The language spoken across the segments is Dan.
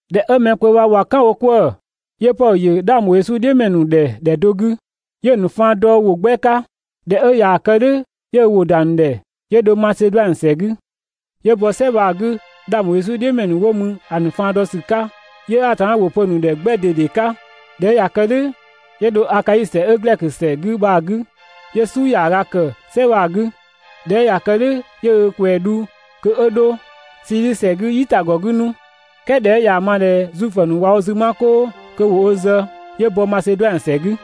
꞊Dhɛ 'ö mɛ kpö bha ꞊wa "kan wo 'kwëë‑, 'yö Pɔdhö ‑yö 'dhang ‑bho Yesu "dhiʋ̈ ‑mɛ ‑nu ‑dhɛ ‑dhɛ do 'gü, 'yö‑ ‑nu faan dɔ ‑wʋ 'gbɛ 'ka. ꞊Dhɛ 'ö ꞊yaa‑ kë "dhʋ̈ 'yö ö ‑wʋ ‑da ‑nu ‑dhɛ 'yö dho Maseduanö ‑sɛ 'gü. 'Yö bɔ "sɛ bha‑ 'gü 'dhang ‑bho Yesu "dhiʋ̈ ‑mɛ ‑nu 'wo mü ‑a ‑nu faan dɔ ‑sü 'ka, 'yö Atanna ‑wʋ pö‑ ‑nu ‑dhɛ 'gbɛ ꞊dede 'ka. ꞊Dhɛ 'ö ꞊ya kë "dhʋ̈, 'yö dho Akai ‑sɛ 'ö Glɛkö ‑sɛ 'gü bha‑ 'gü, 'yö "su ‑yaaga ‑kë "sɛ bha‑ 'gü, ꞊dhɛ 'ö ꞊ya kë "dhʋ̈ 'yö ö ꞊kwɛɛ‑ ‑nu dhu kö 'ö dho Siidhi ‑sɛ 'gü "yitagɔ 'gü 'nu, "kɛɛ ꞊dhɛ 'ö ꞊yaa‑ ma ꞊dhɛ Zuifö ‑nu ꞊wa wo 'zü 'ma "kʋʋ kö ‑wo ö zë, 'yö bɔ Maseduanö ‑sɛ 'gü.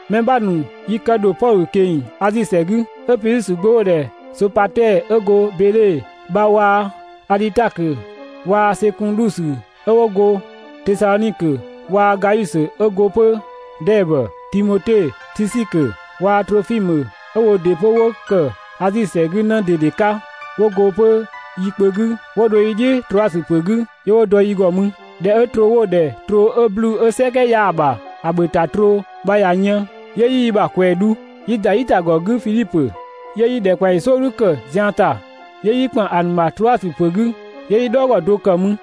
Mɛ 'bha ‑nu yi kë ‑dho Pɔdhö ꞊keng‑ Azi ‑sɛ 'gü. 'Ö Pidhusö gbö 'wo‑ ‑dhɛ Sopatɛɛ 'ö go Beedhe bha waa‑ Adhitakö waa‑ Sekundusö 'ö 'wo go Tesadhonikö waa‑ Gayusö 'ö go 'pö Dɛɛbö, Timote, Tisikö waa‑ Trofimö 'ö woo ‑dɩ 'pö 'wo ‑kë Azi ‑sɛ 'gü 'në ꞊dede 'ka, 'wo go 'pö yi kpö 'gü 'wo dho yi "dhiʋ̈ Troasö ‑pö 'gü 'yö 'wo dɔ yi ‑gɔ mü. ꞊Dhɛ 'ö troo 'wo‑ ‑dhɛ troo 'ö 'bluu‑ 'ö "sɛkɛ 'yaa‑ ‑bha ‑a ‑bhö ‑ta troo bha ꞊ya yën, 'yö 'yi yi ‑bha ꞊kwɛɛ‑ dhu 'yi ‑da "yitagɔ 'gü Fidhipö, 'yö 'yi ‑dhɛkpaɔyi "sɔɔdhu ‑kë zian ‑ta 'yö 'yi ‑kpan ‑a ‑nu ‑bha Troasö ‑pö 'gü 'yö 'yi "dhɔɔgɔ do ‑kë mü.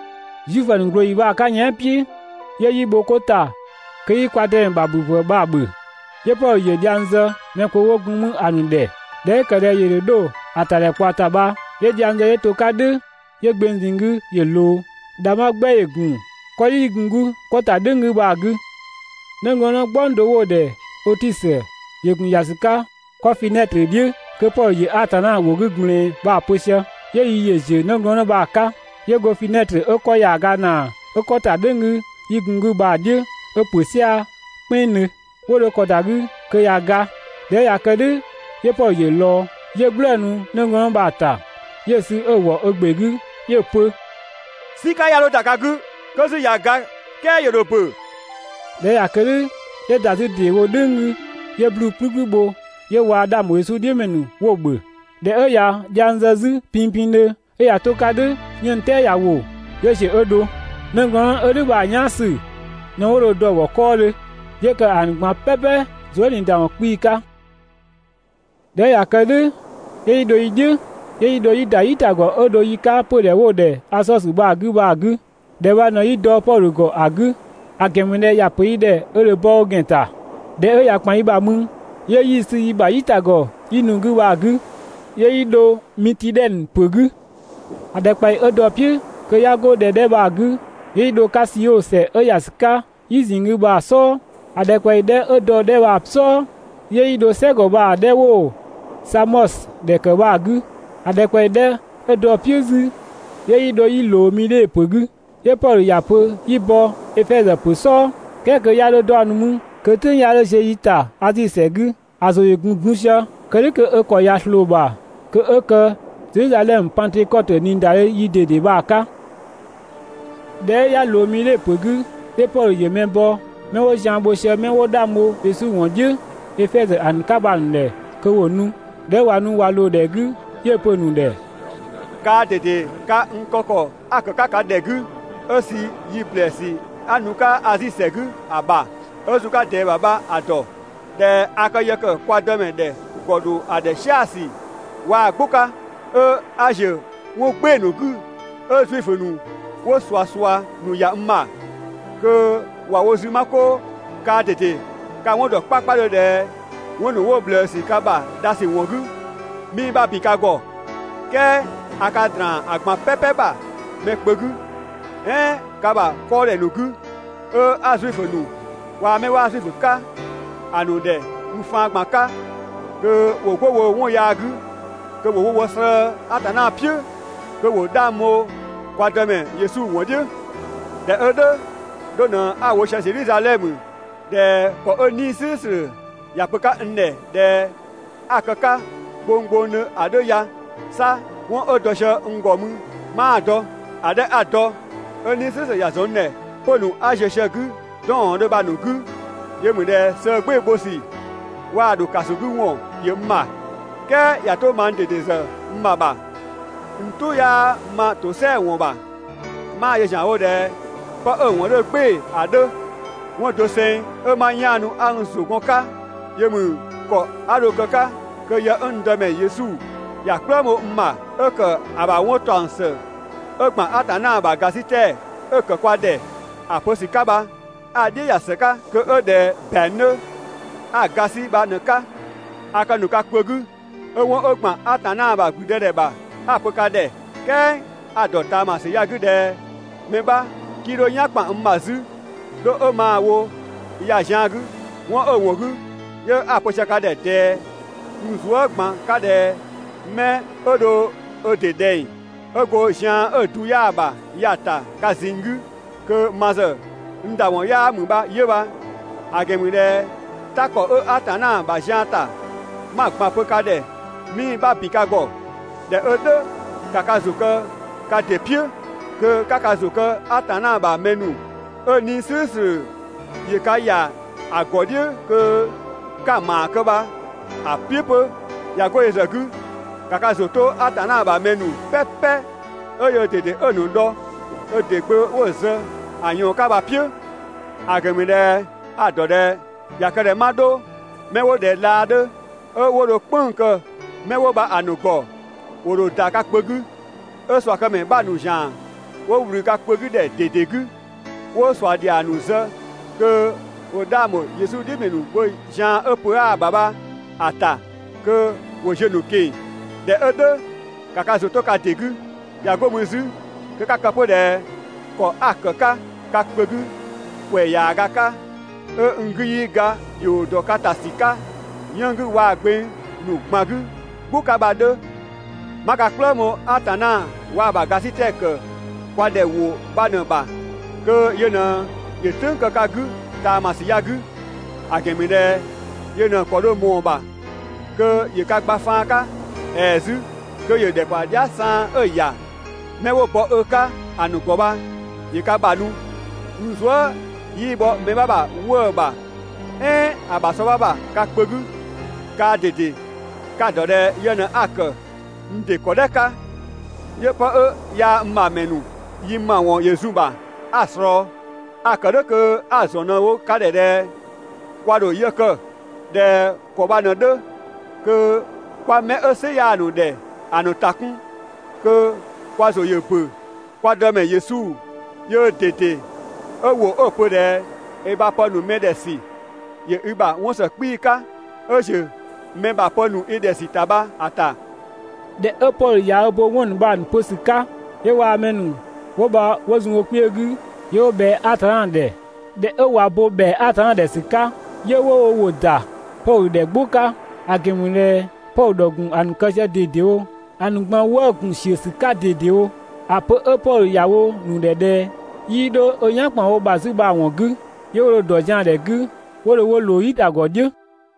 Zuifö ‑nu ꞊glooyi bha‑ 'ka yɛan" "piʋ̈, 'yö 'yi bho 'ko ‑ta kö 'yi ‑bhöpë "slʋ̈ʋ̈slʋ̈ ‑bhö. 'Yö Pɔdhö ‑yö dhiang zë mɛ kpö 'wo gun 'mü ‑a ‑nu ‑dhɛ. ꞊Dhɛ 'ö ‑kë ꞊dhɛ ‑yö ‑dho dho ‑a ‑tadhɛkpaɔ ‑ta bha, 'yö dhiang zë 'yö‑ to‑ 'ka "dhʋ̈, 'yö gbeng ꞊zinng 'gü ‑yö ꞊loo. ‑Dhangbha 'gbɛ ‑yö gun 'kɔdhi 'yi gun‑ 'gü 'kɔ ‑ta "dhʋ̈ng 'gü bha‑ 'gü. 'Nëglɔɔnnë "gbɔng do 'wo‑ ‑dhɛ Ötisö ‑yö ‑gun ‑ya ‑sü 'ka 'kɔ finɛtrö "dhiʋ̈ kö Pɔdhö ‑yö Atanna ‑wʋ 'gü ꞊gblɛɛn bha‑ pö sië, 'yö yi ‑yö ‑ziö 'nëglɔɔnnë bha‑ 'ka, 'yö go finɛtrö 'ö 'kɔ ‑yaaga ‑naa 'ö 'kɔ ‑ta "dhʋ̈ng 'gü, 'yi gun‑ 'gü bha‑ "dhiʋ̈ 'ö ‑pö "sia‑ "kpɛnngdhö. 'Wo dho ‑kɔ ‑da 'gü kö ꞊ya ga. ꞊Dhɛ 'ö ꞊ya kë "dhʋ̈ 'yö Pɔdhö ‑yö ꞊lɔɔ 'yö "gblëënu 'nëglɔɔnnë bha‑ ‑ta 'yö‑ sü 'ö‑ ‑wɔ ö ‑gbe 'gü 'yö‑ pö: «"Sika 'ya 'dho ‑da ka 'gü, (kö 'zü ꞊ya ga "kɛɛ ‑yö ‑dho ‑bö)!» ꞊Dhɛ 'ö ꞊ya kë "dhʋ̈, 'yö ‑da 'zü ‑deewo "dhʋ̈ng 'gü 'yö 'bluu‑ "kplükplü bho 'yö waa‑ 'dhang ‑bho Yesu "dhiʋ̈ ‑mɛ ‑nu 'wo‑ ‑bhö. ꞊Dhɛ 'ö ꞊ya dhiang zë 'zü pinpindhö 'ö ꞊ya 'to‑ 'ka "dhʋ̈ 'yënng‑ "tɛɛ ꞊ya ‑wo, 'yö ‑ziö 'ö dho. 'Nëglɔɔnnë 'ö "dhʋ̈ bha‑ "yaan ‑sü ꞊në 'wo dho‑ dɔ‑ ‑gɔ 'kɔɔdhö, 'yö ‑kë ‑a ‑nu ꞊gban "pɛpɛ zuë" ꞊niida ‑wɔn 'kpii‑ 'ka. ꞊Dhɛ 'ö ꞊ya kë "dhʋ̈ 'yö 'yi dho "dhiʋ̈, 'yö 'yi dho 'yi ‑da "yitagɔ 'ö dho yi 'ka 'pödhɛ 'wo‑ ‑dhɛ Asɔsö bha‑ 'gü bha‑ 'gü. ‑Dhɛ bha ꞊në 'yi dɔ Pɔdhö ‑gɔ ‑a 'gü, ‑a ‑gɛn ‑mü ꞊dhɛ ‑ya ‑pö yi ‑dhɛ ö ‑dho bɔ ö ‑gɛn ‑ta. ꞊Dhɛ 'ö ꞊ya ‑kpan yi ‑bha mü, 'yö 'yi‑ sü yi ‑bha "yitagɔ 'yi nu‑ 'gü bha‑ 'gü, 'yö yi dho Mitidhɛnö ‑pö 'gü. ‑A ‑dhɛkpaɔyi 'ö dɔ‑ "piʋ̈ kö 'ya 'go ‑dhɛ 'dhɛ bha‑ 'gü, 'yö 'yi dho‑ 'ka Sio ‑sɛ 'ö ‑ya ‑sü 'ka "yi ꞊zinng 'gü bha‑ "sɔɔ. ‑A ‑dhɛkpaɔyi 'dhɛ 'ö dɔ‑ 'dhɛ bha‑ "sɔɔ, 'yö 'yi dho "sɛgɔ bha‑ 'dhɛ 'wo‑ Samɔsö ‑dhɛ ‑kë bha‑ 'gü. ‑A ‑dhɛkpaɔyi 'dhɛ 'ö dɔ‑ "piʋ̈ 'zü 'yö 'yi dho 'yi ꞊loo Midhe ‑pö 'gü. 'Yö Pɔdhö ‑ya pö 'yi bɔ Efɛzö ‑pö "sɔɔ, "kɛɛ kö 'ya 'dho 'daɔnnu mü kö "tʋ̈ng 'ya 'dho ziö yi ‑ta Azi ‑sɛ 'gü. ‑A ‑zʋ ‑yö ‑gun dun sië, kë "dhʋ̈ kö ö ‑kɔ ꞊ya ꞊sloo‑ ‑bha, kö 'ö kë Zedhizadhɛmö Pangtökɔtö ꞊niidadhe ‑yi ꞊dede bha‑ 'ka. ꞊Dhɛ 'ö 'ya ꞊loo Midhe ‑pö 'gü, 'yö Pɔdhö ‑yö mɛ bɔ 'mɛ 'wo zian bho sië 'mɛ 'wo 'dhang bho Yesu ‑wɔn "dhiʋ̈ Efɛzö ‑a ‑nu 'ka 'bha‑ ‑nu ‑dhɛ kö ‑wo nu. ꞊Dhɛ 'ö ꞊wa nu ꞊wa ꞊loo‑ ‑dhɛ 'gü, 'yö‑ pö‑ ‑nu ‑dhɛ: «Kaa ꞊dede ka n kë ‑kɔ 'a ‑kë 'ka ka ‑dhɛ 'gü 'ö sü yi ‑blɛɛsü 'a nu‑ 'ka Azi ‑sɛ 'gü ‑a ‑bha 'ö zun‑ 'ka ꞊dɛɛ ‑bha bha‑ ‑dɔ. ꞊Dhɛ a ka yë ‑kë kwa Dëmɛ ‑dhɛ ‑gɔ ‑dho ‑a ‑dhɛ "sia‑ ‑sü waa‑ "gbʋ 'ka 'ö 'a ‑ziö 'wɔn "gbɩɩ‑ ‑nu 'gü, 'ö Zuifö ‑nu 'wo ꞊suasua ‑nu ‑ya n ‑bha kö ꞊wa wo zü 'ma 'koo. Kaa ꞊dede ka‑ 'wɔn ‑dɔ 'kpakpadhö ꞊dhɛ 'wɔn ‑nu 'wo ꞊bhlëësü ka ‑bha dhasü ‑wɔn 'gü, 'mii‑ 'bha ‑bin ka ‑gɔ, "kɛɛ a ka ‑draan ‑a ꞊gban "pɛpɛ ‑bha mɛ kpö 'gü, "ɛɛn ka ‑bha 'kɔɔdhɛ ‑nu 'gü, 'ö 'a Zuifö ‑nu waa‑ 'mɛ 'waa Zuifö 'ka ‑a ‑nu ‑dhɛ n faan ꞊gban 'ka kö ‑wo 'go woo‑ 'wɔn yaa 'gü kö ‑wo slëë‑ Atanna "piʋ̈, kö ‑wo 'dhang bho kwa Dëmɛ Yesu ‑wɔn "dhiʋ̈. ꞊Dhɛ 'ö "dhʋ̈, 'dho ꞊në 'a‑ wo sië Zedhizadhɛmö ꞊dhɛ ‑kɔ 'ö 'Nii‑ "slʋ̈ʋ̈slʋ̈ ‑ya pö‑ 'ka n ‑dhɛ ꞊dhɛ 'a‑ kë‑ 'ka gbonggbongdhö ‑a 'dhö ya. 'Sa 'wɔn 'ö dɔ sië n ‑gɔ mü 'maa‑ dɔ. ‑A 'dhɛ 'a‑ ‑dɔ 'ö 'Nii‑ "slʋ̈ʋ̈slʋ̈ ‑ya ‑zɔn n ‑dhɛ 'pö‑ ‑nu 'a ziö sië‑ 'gü 'dɔɔndhö bha‑ ‑nu 'gü, yö ‑mü ꞊dhɛ sëë "gbɩɩ‑ bho ‑sü waa‑ ‑dho ‑kaso 'gü ‑wɔn ‑yö n ‑bha. "Kɛɛ ꞊ya 'to mang ꞊dede ‑zë n ‑bha ‑bha, n "tʋ 'yaa ma ‑tosɛa ‑wɔn ‑bha, 'maa‑ yö ‑zianwo ꞊dhɛ 'pë 'ö‑ ‑wɔn 'dhö "gbɩɩ‑ ‑a 'dhö, 'wɔn doseng 'ö ma 'yaanu 'a n ‑zʋ gɔn‑ 'ka, ‑yö ‑mü ‑kɔ 'a dho‑ kë‑ 'ka kö yë 'ö n Dëmɛ Yesu ‑ya "kplëng bho n ‑bha, 'ö ‑kë ‑a ‑bha 'wɔn ‑taɔng ‑së 'ö ‑gban Atanna ‑bha ‑gasitɛ 'ö‑ ‑kë kwa ‑dhɛ ‑a ‑bha ‑a pö ‑sü 'ka bha 'a‑ "dhiʋ̈ ‑ya ‑së 'ka, kö 'ö ꞊dhɛ ‑bɛang 'dhö 'a‑ ‑ga 'sü bha ꞊në‑ 'ka. A kë ‑nu ka kpö 'gü 'ö 'wɔn 'ö ‑gban Atanna ‑bha ‑gblüdëdhɛ ‑bha 'a‑ pö ka ‑dhɛ, "kɛɛ a‑ ‑dɔ ꞊taama ‑sü ya‑ 'gü ꞊dhɛ mɛ 'bha 'kii 'dho "yan ‑kpan n ‑bha 'zü, 'dho 'ö maa‑ wo ya‑ zian‑ 'gü. 'Wɔn 'ö‑ ‑wɔn 'gü, 'yö 'a‑ pö sië ka ‑dhɛ ꞊dɛɛ n zuë" ꞊gban 'ka ꞊dhɛ 'mɛ 'ö dho ö ‑dɩ ꞊dhɛng, ('ö go zian 'ö‑ du 'yaa‑ ‑bha ya‑ ‑ta) ka ꞊zinng 'gü, kö ma ‑zë n ‑da ‑wɔn 'yaa ‑mü bha 'yö bha, ‑a ‑gɛn ‑mü ꞊dhɛ "ta ‑kɔ 'ö Atanna ‑bha zian ‑ta 'ma‑ ꞊gban pö ka ‑dhɛ 'mii‑ 'bha ‑bin ka ‑gɔ. ꞊Dhɛ 'ö "dhʋ̈, ‑ka ka ‑zʋ kë ka ‑dɩ "piʋ̈ kö 'ka ka ‑zʋ kë Atanna ‑bha mɛ ‑nu 'ö 'Nii‑ "slʋ̈ʋ̈slʋ̈ ‑yö ka ‑ya ‑a ‑gɔ "dhiʋ̈ kö 'ka‑ ‑maa kë bha‑ "piʋ̈ 'pö! ꞊Ya 'go yö ‑zë 'gü, ‑ka ka ‑zʋ 'to Atanna ‑bha mɛ ‑nu "pɛpɛ 'ö yöö ꞊dede 'ö‑ ‑nu dhɔ ö ‑dɩ Gbö 'wo‑ zë ‑a ꞊yɔɔn 'ka bha‑ "piʋ̈; ‑a ‑gɛn ‑mü ꞊dhɛ a‑ ‑dɔ ꞊dhɛ ꞊ya kë ꞊dhɛ 'ma 'dho, 'mɛ 'wo ꞊dhɛ laa 'dhö 'ö 'wo dho "kpënng‑ kë 'mɛ 'wo bha‑ ‑nu ‑gɔ, ‑wo ‑dho ‑da ka kpö 'gü. 'Ö ꞊suakëmɛ 'bha ‑nu ‑zian 'wo ꞊wlü ka kpö 'gü ‑dhɛ ꞊dede 'gü 'wo ꞊sua ‑dhiang ‑nu zë kö 'wo 'dhang ‑bho Yesu "dhiʋ̈ ‑mɛ ‑nu bho zian 'ö pö 'aa‑ ‑bha bha‑ ‑ta kö ‑wo ziö‑ ‑nu ꞊keng‑. ꞊Dhɛ 'ö "dhʋ̈ ‑ka ka ‑zʋ 'to ka ‑dɩ 'gü! ꞊Ya 'go mü 'zü kö 'ka‑ kë 'pö ꞊dhɛ ‑kɔ 'a‑ ‑kë 'ka ka kpö 'gü ‑kwɛ ‑yaaga 'ka, 'ö n 'gü 'yii ga ‑dhio ‑dɔ ka ‑ta ‑sü 'ka 'yënng‑ 'gü waa‑ gbeng ‑nu ꞊gban 'gü "gbʋ 'ka bha‑ 'dhö. 'Ma ka "kplëng bho Atanna waa‑ ‑bha ‑gasitɛ ‑kë kwa ‑dhɛ ‑wʋ bha ꞊në‑ ‑bha kö yö ꞊në ‑yö ö "tʋ̈ng kë ka 'gü ꞊taama ‑sü ya‑ 'gü, ‑a ‑gɛn ‑mü ꞊dhɛ yö ꞊në‑ ‑kɔ dho ꞊mɔɔ‑ ‑bha kö ‑yö ka gba faan 'ka, ‑ɛɛ 'zü kö ‑yö ‑dhɛkpaɔ dhia" saan 'ö‑ ‑ya 'mɛ 'wo bɔ ö 'ka‑ ‑nu ‑gɔ bha ‑yö ka ‑bha nu. N zuë" 'yii bhɔ mɛ 'bha ‑bha 'wëë‑ ‑bha, "ɛɛn ‑a ‑bha sɔ 'bha ‑bha ka kpö 'gü. Kaa ꞊dede, ka‑ ‑dɔ ꞊dhɛ yë ꞊në 'a‑ ‑kë n ‑dɩ ‑kɔdhɛ 'ka 'yö 'pë 'ö yaa ma ‑mɛ ‑nu yi ‑mawɔn ‑yö zun‑ ‑bha 'a‑ ꞊slɔɔ. A‑ ‑kë "dhʋ̈ kö 'a‑ ‑zɔn ꞊në‑ wo ka ‑dhɛ ꞊dhɛ kwa ‑dho yë kë ꞊dhɛ ‑kɔ bha ꞊në‑ 'dhö kö 'kwa mɛ 'ö "sɩ 'yaa‑ ‑nu ‑dhɛ ‑a ‑nu ‑ta 'kun, kö kwa ‑zʋ ‑yö ‑bö kwa Dëmɛ Yesu yöö ꞊dede 'ö ‑wʋ 'ö‑ pö ꞊dhɛ: «I ‑bha pë ‑nu mɛ ‑dhɛ ‑sü ‑yö i ‑bha 'wɔn ‑së 'kpii‑ 'ka 'ö ꞊ziö‑ mɛ ‑bha pë ‑nu i ‑dhɛ ‑sü ‑ta bha‑ ‑ta».» ꞊Dhɛ 'ö Pɔdhö ꞊ya bo 'wɔn ‑nu bha‑ ‑nu pö ‑sü 'ka, 'yö waa‑ 'mɛ ‑nu 'wo bha 'wo zun wo kpiö 'gü 'yö 'wo ꞊bhɛa‑ ‑dhɛ. ꞊Dhɛ 'ö ꞊wa bo ‑bhɛa Atanna ‑dhɛ ‑sü 'ka, 'yö 'wo wo ‑wʋ ‑da Pɔdhö ‑dhɛ "gbʋ 'ka, ‑a ‑gɛn ‑mü ꞊dhɛ Pɔdhö ‑dhɔ ‑gun ‑a ‑nu kë sië ꞊dedewo. ‑A ‑nu ꞊gban wëë'‑ ‑gun ‑siö ‑sü 'ka ꞊dedewo ‑a pö 'ö Pɔdhö ‑ya wo‑ ‑nu ‑dhɛ ꞊dhɛ 'yii 'dho ö "yan ‑kpan wo ‑bha 'zü bha‑ ‑wɔn 'gü. 'Yö 'wo dho‑ ‑dɔ zian ‑dhɛ 'gü 'wo dho 'wo ꞊loo "yitagɔ "dhiʋ̈.